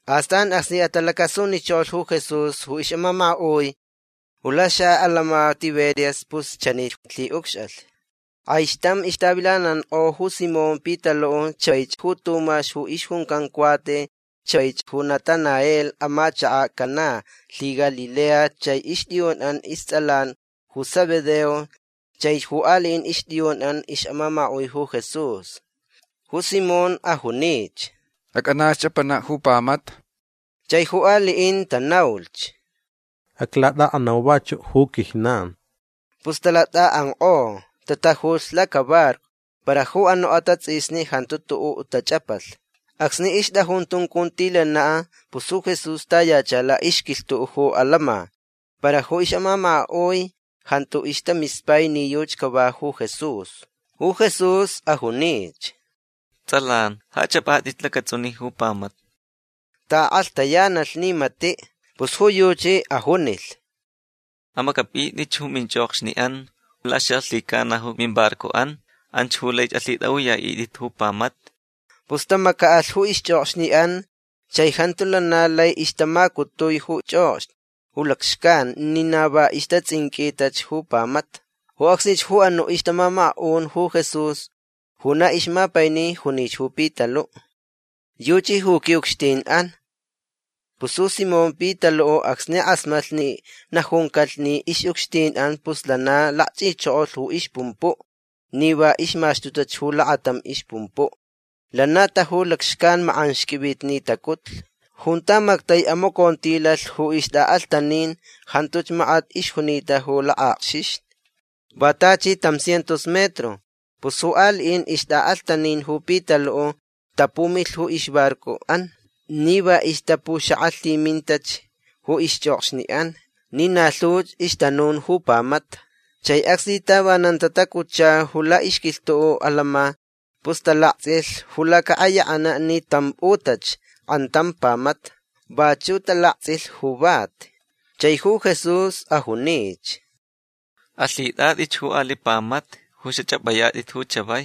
Astan acsni atalacasunichokolh ju Jesús ju ixʼamamakaʼui ju laxaʼatantsʼin Tiberias pus chanich lhiʼucxʼalh. Kʼaixtam ixtavilanankʼo ju Simón Pitaluʼ chaich ju Tumax ju ixjuncan Cuate chaich ju Natanael amachakaʼ Caná lhiGalilea chai ixtʼiyunʼan istsʼalan ju Zebedeo chaich ju aliʼin ixtʼiyunʼan ixʼamamakaʼui ju Jesús. Ju Simón ajunich: ―Acʼanaʼ chʼapanaʼ ju pamata. Chai ju aliʼin tanaulhch: ―Aclatʼaʼanau vachuʼ ju quijnan. Pus talatʼaʼankʼo. Tatajulh lacabarco. Para ju anuʼ atatsʼisni jantu tuʼuʼ tachʼapalh. Acsni ixtʼajun tuncuntilanaʼ pus ju Jesús tayacha laʼixquilhtuʼ ju atantsʼin. Para ju ixʼamamakaʼui jantu ixtamispai ni yuchi cava ju Jesús. Ju Jesús ajunich: ―Tsʼalan ja chʼapʼatʼitch lacatsʼunin ju pamata. Taʼakʼalhtayanalh ni matiʼ. Pus ju yuchi ajunilh: ―Amacʼapʼitʼitch ju minchʼokxniʼan laxalhicana ju mimbarcoʼan. Anch ju lai alhitʼaʼuyaʼitʼit ju pamata. Pus tamacaʼalh ju ixchʼokxniʼan chai jantu lana lai ixtamacutui ju chʼokxni ju lacxcan ni na va ixtatsʼinqʼuitach ju pamata. Ju acsnich ju anuʼ ixtamamakaʼun ju Jesús ju na ixmapaini junich ju Pitaluʼ: ―Yuchi ju quiʼucxtinʼan. Pus ju Simón Pitaluʼ acsni kʼasmatlh ni najuncalh ni ixʼucxtinʼan pus lana lakchʼichokolh ju ixpumpuʼ ni va ixmaxtutach ju lakatam ixpumpuʼ. Lana taju lacxcan. Makʼanxqʼuivitnitacutlh. Junta mactai amacontilalh ju ixtʼaʼalhtanin jantuch makat ixjunita ju lakʼakxixni. Va tachi tam cientos metro. Pus ju aliʼin ixtʼaʼalhtanin ju Pitaluʼ tapumilh ju ixbarcoʼan ni va ixtapuxakʼamalhimintach ju ixchʼokxniʼan ni na lhuch ixtanun ju pamata. Chai acsni tavanan tatacutcha ju laʼixquilhtuʼ atantsʼin pus talaktsʼilhch ju lacaʼayakʼanaʼ ni tampʼutʼach kʼantam pamata. Vachuʼ talaktsʼilh ju vati. Chai ju Jesús ajunich: ―Alhitʼatʼitch ju aliʼ pamata ju xachʼapʼayatʼit chavai.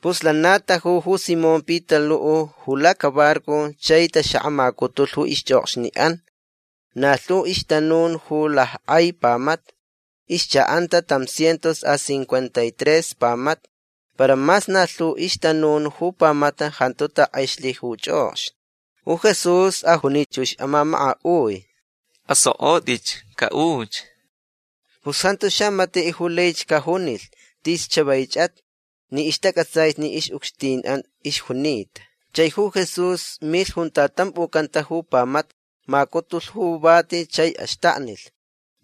Pus lana taju ju Simón Pitaluʼ ju lacabarco chai taxakʼamacutulh ju ixchʼokxniʼan. Na lhu ixtanun ju lackʼai pamata. Ixchaʼanta tam cientos a cincuenta y tres pamata. Para mas na lhu ju ixtanun ju pamata jantu talackʼexlh ju chʼokxni. Ju Jesús ajunich ju ixʼamamakaʼui: ―Asokʼotʼitch. Caʼuch. Pus jantu xamatiʼ ju laich cajunilh: “Tis chavaichʼat” ni ixtacʼatsaich ni ixʼucxtinʼan ixjunita. Chai ju Jesús milh junta tʼampʼucanta ju pamata. Macutulh ju vati chai axtaknilh.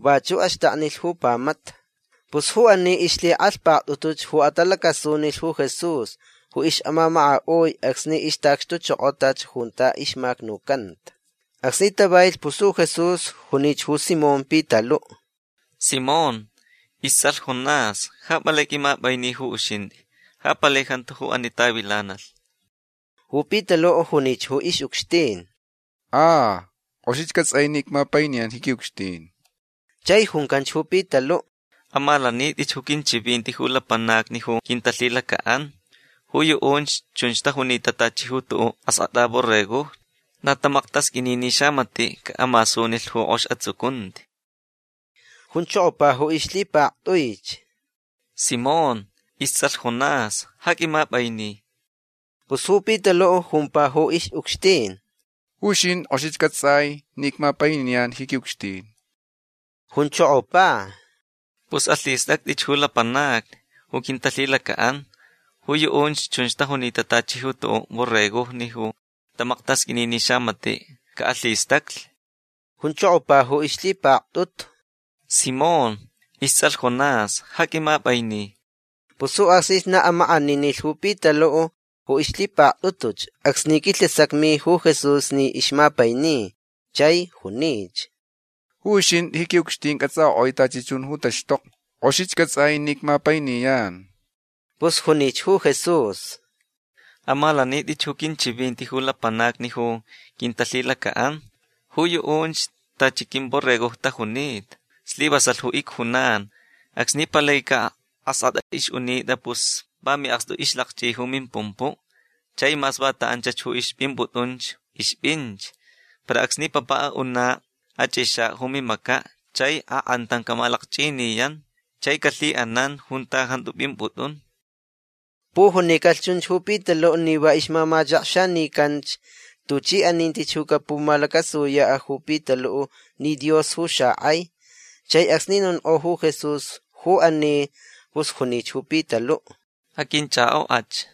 Vachuʼ axtaknilh ju pamata. Pus ju ani ixlhikʼalhpaktʼutuch ju atalacasunilh ju Jesús ju ixʼamamakaʼui acsni ixtaʼacxtuchokotach junta ixmacnucanta. Acsni tavailh pus ju Jesús junich ju Simón Pitaluʼ: ―Simón istsʼalh Jonás ja palai qʼuimapʼaini ju uxintʼi. Ja palai jantu ju ani tavilanalh. Ju Pitaluʼ junich ju ixʼucxtin: ―A. Kʼoxich cʼatsʼai ni icmapainiyan ji quiʼucxtin. Chai juncanch ju Pitaluʼ: ―Amalanitʼich ju quinchivinti ju lapanacni ju quintalhilacaʼan. Ju yuʼunch chunch tajunita tachi ju tuʼuʼ askʼatʼa borregojni. Na tamaktasqʼuini ni xamatiʼ caʼamasunilh ju kʼox atsucunti. Junchokopa ju ixlhipaktʼuich: ―Simón istsʼalh Jonás ja qʼuimapʼaini. Pus ju Pitaluʼ jumpa ju ixʼucxtin: ―Ju uxintʼi kʼoxich cʼatsʼai ni icmapainiyan ji quiʼucxtin. Junchokopa: ―Pus alhistʼactʼich ju lapanacni ju quintalhilacaʼan. Ju yuʼunch chunch tajunita tachi ju tuʼuʼ borregojni ju tamaktasqʼuini ni xamatiʼ caʼalhistaclh. Junchokopa ju ixlhipaktʼutu: ―Simón istsʼalh Jonás ja qʼuimapʼaini. Pus ju acsnich na amakʼaninilh ju Pitaluʼ ju ixlhipaktʼutuch acsni quilhasacmi ju Jesús ni ixmapaini. Chai junich: ―Ju uxintʼi ji quiʼucxtin cʼatsʼakʼoʼui tachi chun ju taxtokni. Kʼoxich cʼatsʼai ni icmapainiyan. Pus junich ju Jesús: ―Amalanitʼich ju quinchivinti ju lapanacni ju quintalhilacaʼan. Ju yuʼunch tachi quimborregojni tajunita. Slivasalh ju icjunan. Acsni palaicaʼ askʼatʼa ixʼunitʼa pus va miʼakstu ixlakchʼi ju mimpumpuʼ. Chai mas vanta anch ju ixpʼimpʼutʼunch ixpʼinch. Para acsni papaʼ aʼunaʼ achʼixaʼ ju mimacaʼ chai akʼantam camalakchʼiniyan chai calhiʼanan junta jantu pʼimpʼutʼun. Pujunicalh chunch ju Pitaluʼ ni va ixmamachakxanicanch tuchi aninti ju capumalacasuyaʼ ju Pitaluʼ ni Dios ju xakʼai. Chai acsni nonkʼo ju Jesús ju ani pus junich ju Pitaluʼ: ―Aqʼuinchʼakʼokʼach.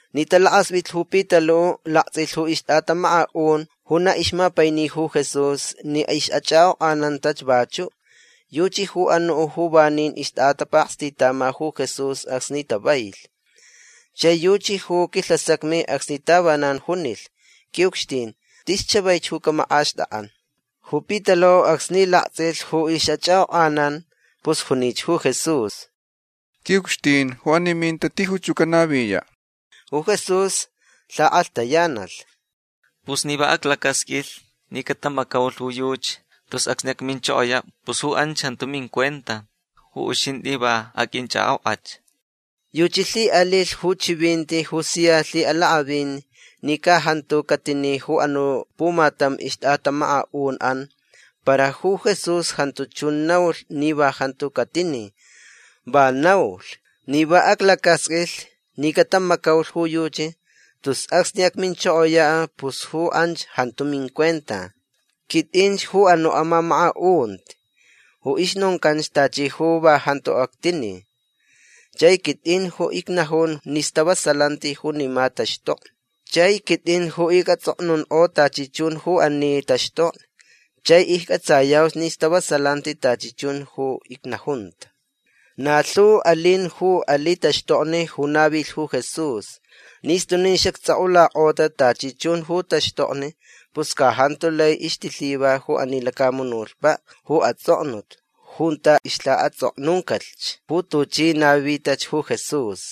Ni talakaspʼitlh ju Pitaluʼ laktsʼilhch ju ixtʼatamamakaʼun ju na ixmapainich ju Jesús ni ixʼachʼakʼokʼanantach vachuʼ. Yuchi ju anuʼ ju vanin ixtʼatapakstitama ju Jesús acsni tavailh. Chai yuchi ju quilhasacmi acsni tavanan junilh: “Quiʼucxtin tis chavaich ju camakʼaxtʼakʼan”. Ju Pitaluʼ acsni laktsʼilh ju ixʼachʼakʼokʼanan pus junich ju Jesús: ―Quiʼucxtin ju ani minta tijuch ju canaviyaʼ. Ju Jesús lhakʼalhtayanalh: ―Pus ni va aclacasqʼuilh ni catamacaulh ju yuchi tus acsni acminchokoyaʼ pus ju anch jantu mincuenta. Ju uxintʼi va aqʼuinchʼakʼokʼach. Yuchi lhiʼalilh ju chivinti ju sia lhiʼalakʼavin ni ca jantu catini ju anuʼ pumatam ixtʼatamamakaʼunʼan. Para ju Jesús jantu chun naulh ni va jantu catini. Va naulh: “Ni va aclacasqʼuilh ni catamacaulh ju yuchi tus acsni acminchokoyach pus ju anch jantu mincuenta”. Quitʼinch ju anuʼ amamakaʼunti ju ixnoncanch tachi ju va jantu actini. Chai quitʼin ju icnajun ni stavasalanti junima taxtokni. Chai quitʼin ju icʼatsʼoknunkʼo tachi chun ju ani taxtokni. Chai iccʼatsayauch ni stavasalanti tachi chun ju icnajunta. Na lhu alin ju aliʼ taxtokni ju navilh ju Jesús. Ni stunin xactsʼokʼulakʼota tachi chun ju taxtokni pus ca jantu lai ixtilhiva ju ani lacamunutpaʼ ju atsʼoknut junta ixlhaʼatsʼoknuncalhch ju tuchi navitach ju Jesús.